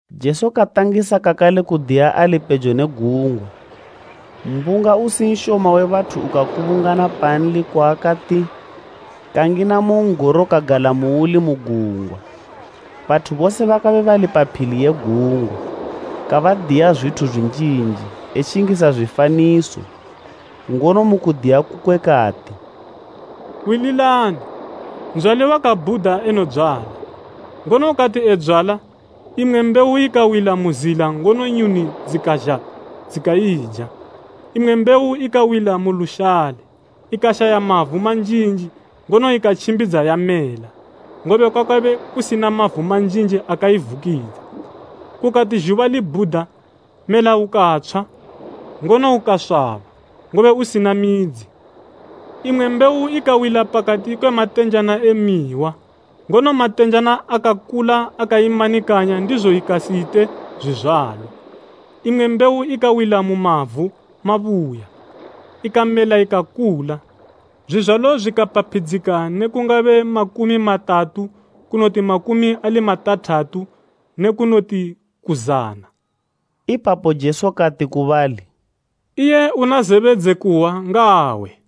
Jesu katangisa kakale kudiya ali pejo ne gungwa. Mbunga usinshoma we bathu ukakubungana panli kwaakati kangina mu n'goro kagala muuli mu gungwa. Bathu bose bakabe bali pa phili ye gungwa. Kabadiya zwithu zwinjinji eshingisa zwifaniso, ngono mu kudiya kukwe kati: “Hwililani! Ndzwali wakabhuda enodzwala. Ngono kati edzwala imwe mbewu ikawila mu zila ngono nyuni dzikazha dzikaija. Imwe mbewu ikawila mu lushale, ikashaya mavu manjinji ngono ikatjimbidza yamela, ngobe kwakabe kusina mavu manjinji akaivukidza. Kukati zhuba libhuda, mmela ukatshwa ngono ukaswaba, ngobe usina midzi. Imwe mbewu ikawila pakati kwe matenjana e mihwa ngono matenjana akakula akaimanikanya ndizo ikasiyite zwizwalo. Imwe mbewu ikawila mu mavu mabuya. Ikamela ikakula, zwizwalo zwikapaphidzika ne kungabe makumi matatu kunoti makumi ali matathatu ne kunoti ku zana.” Ipapo Jesu kati ku bali, “Iye una zebe dze kuhwa ngaahwe!”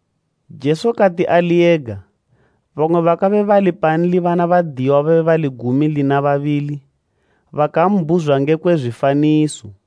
Jesu kati aliyega, bamwe bakabe bali panli bana badiyiwa babe bali gumi lina babili, bakambhuzwa ngekwe zwifaniso.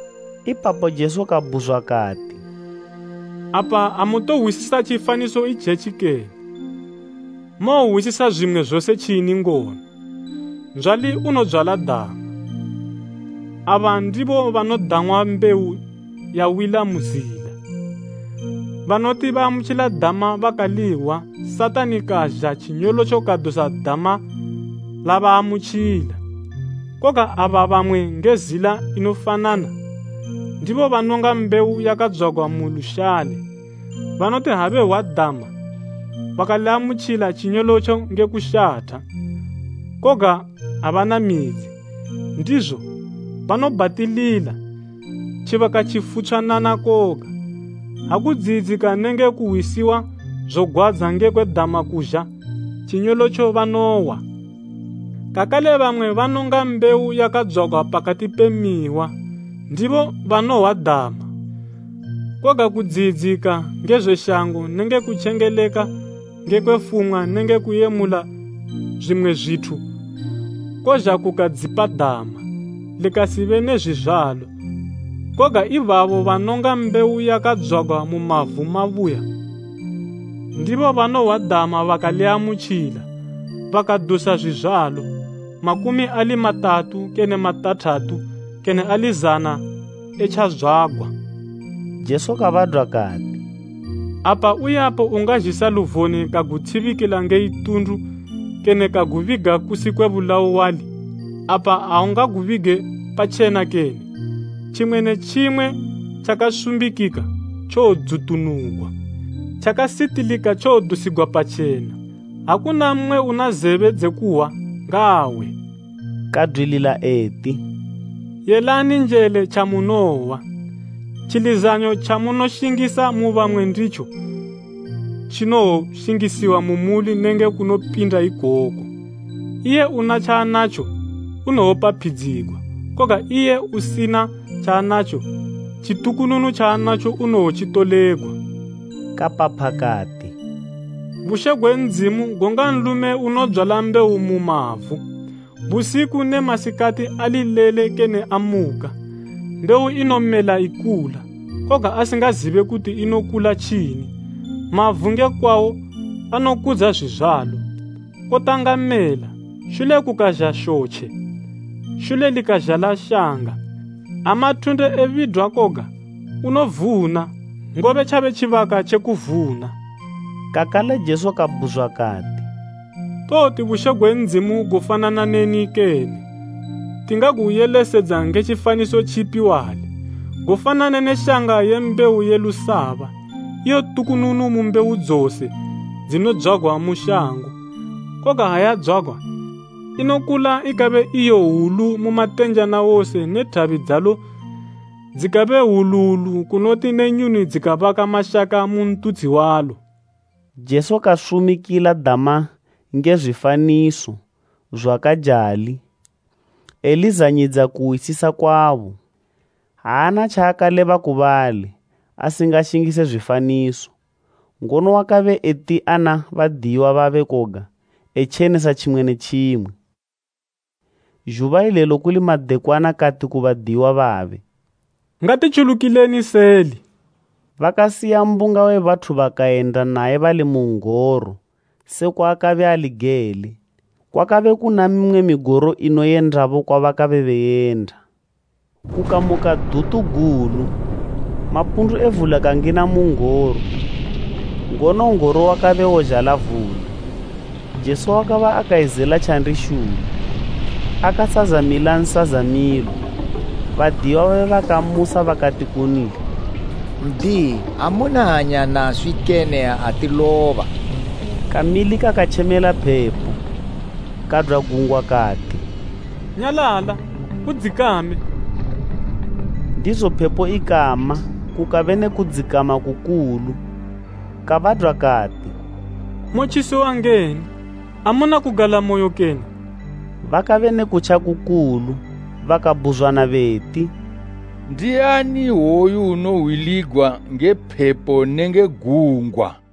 Ipapo Jesu kababhuzwa kati, “Apa amutohwisisa tjifaniso itjetji kene? Mowohwisisa zwimwe zose tjini ngono? Ndzwali unodzwala dama. Aba ndibo banonga mbewu yawila mu zila, banoti baamutjila dama bakalihwa; Satani kazha tjinyolotjo kadusa dama labaamutjila. Koga aba bamwe nge zila inofanana, ndibo banonga mbewu yakadzwagwa mu lushale. Banoti ha behwa dama, bakaliamutjila tjinyolotjo nge kushatha. Koga abana midzi, ndizo banobhatilila tjibaka tjifutshwanana koga. Ha kudziyidzika nenge kuhwisiwa zogwadza ngekwe dama kuzha, tjinyolotjo banowa. Kakale bamwe banonga mbewu yakadzwagwa pakati pe mihwa, ndibo banohwa dama, koga kudziyidzika nge zwe shango nenge kutjengeleka ngekwe fumwa nenge kuyemula zwimwe zwithu, kozha kukadzipa dama, likasibe ne zwizwalo. Koga ibabo banonga mbewu yakadzwagwa mu mavu mabuya, ndibo banohwa dama bakaliamutjila, bakadusa zwizwalo, makumi ali matatu kene matathatu kene ali zana etjadzwagwa.” Jesu kabadwa kati, “Apa uyapo ungazhisa luvone kakogutshibikila nge itundu, kene kagubiga kusi kwe bulawo wali? Apa aangagubige patjena kene? Tjimwe ne tjimwe tjakasumbikika tjowodzutunugwa, tjakasitilika tjowodusigwa patjena. Ha kuna mmwe una zebe dze kuhwa ngaahwe.” Kadwilila eti, “Yelani njele tjamunohwa! Tjilizanyo tjamunoshingisa mu bamwe nditjo tjinowoshingisiwa mu muli nenge kunopinda ikoko. Iye una tjaanatjo unowopaphidzigwa, koga iye usina tjaanatjo, tjitukununu tjaanatjo unowotjitolegwa.” Kapapha kati, “Bushe gwe Ndzimu gonga nlume unodzwala mbewu mu mavu. Busiku ne masikati ali lele kene amuka, mbewu inomela ikula, koga asingazibe kuti inokula tjini. Mavu nge kwawo anokudza zwizwalo. Kotanga mmela, shule kukazha shotje, shule likazhala shanga. Ha mathunde ebidwa koga, unovuna, ngobe tjabe tjibaka tje kuvuna.” Kakale Jesu kabhuzwa kati, “Towoti bushe gwe Ndzimu gofanana neni kene? Tingauyelesedza nge tjifaniso tjipi wali? Gofanana ne shanga ye mbewu ye lusaba, iyo tukununu mu mbewu dzose dzinodzwagwa mu shango. Koga ha yadzwagwa, inokula ikabe iyo hwulu mu matenjana wose ne thabi dzalo dzikabe hwuluhwulu kunoti ne nyuni dzikabaka mashaka mu ntutshi walo.” Jesu kasumikila dama nge zwifaniso zwakajali, elizanyidza kuhwisisa kwabo. Aana tjaakaleba ku bali asingashingise zwifaniso. Ngono wakabe eti ana badiyiwa babe koga, etjenesa tjimwe ne tjimwe. Zhuba ilelo kuli madekwana kati ku badiyiwa babe, “Ngatitjulukileni seli.” Bakasiya mbunga we bathu bakayenda naye bali mu n'goro sekwa akabe ali gele. Kwakabe kuna mimwe migoro inoyendabo kwabakabe beyenda. Kukamuka dutu gulu, mapundu e vula kangina mu n'goro, ngono n'goro wakabe wozhala vula. Jesu wakabe akaizela tjandishule, akasazamila nsazamilo, badiyiwa babe bakammusa bakati kunli, “N'diyi, amuna hanya naswi kene ha tiloba?” Kamilika katjemela phepo, kadwa gungwa kati, “Nyalala! Udzikame!” Ndizo phepo ikama kukabe ne kudzikama kukulu. Kabadwa kati, “Motjisiwa ngeni, amuna kugalamoyo kene?” Bakabe ne kutja kukulu, bakabhuzwana beti, “Ndiani iwoyu unohwiligwa nge phepo nenge gungwa!”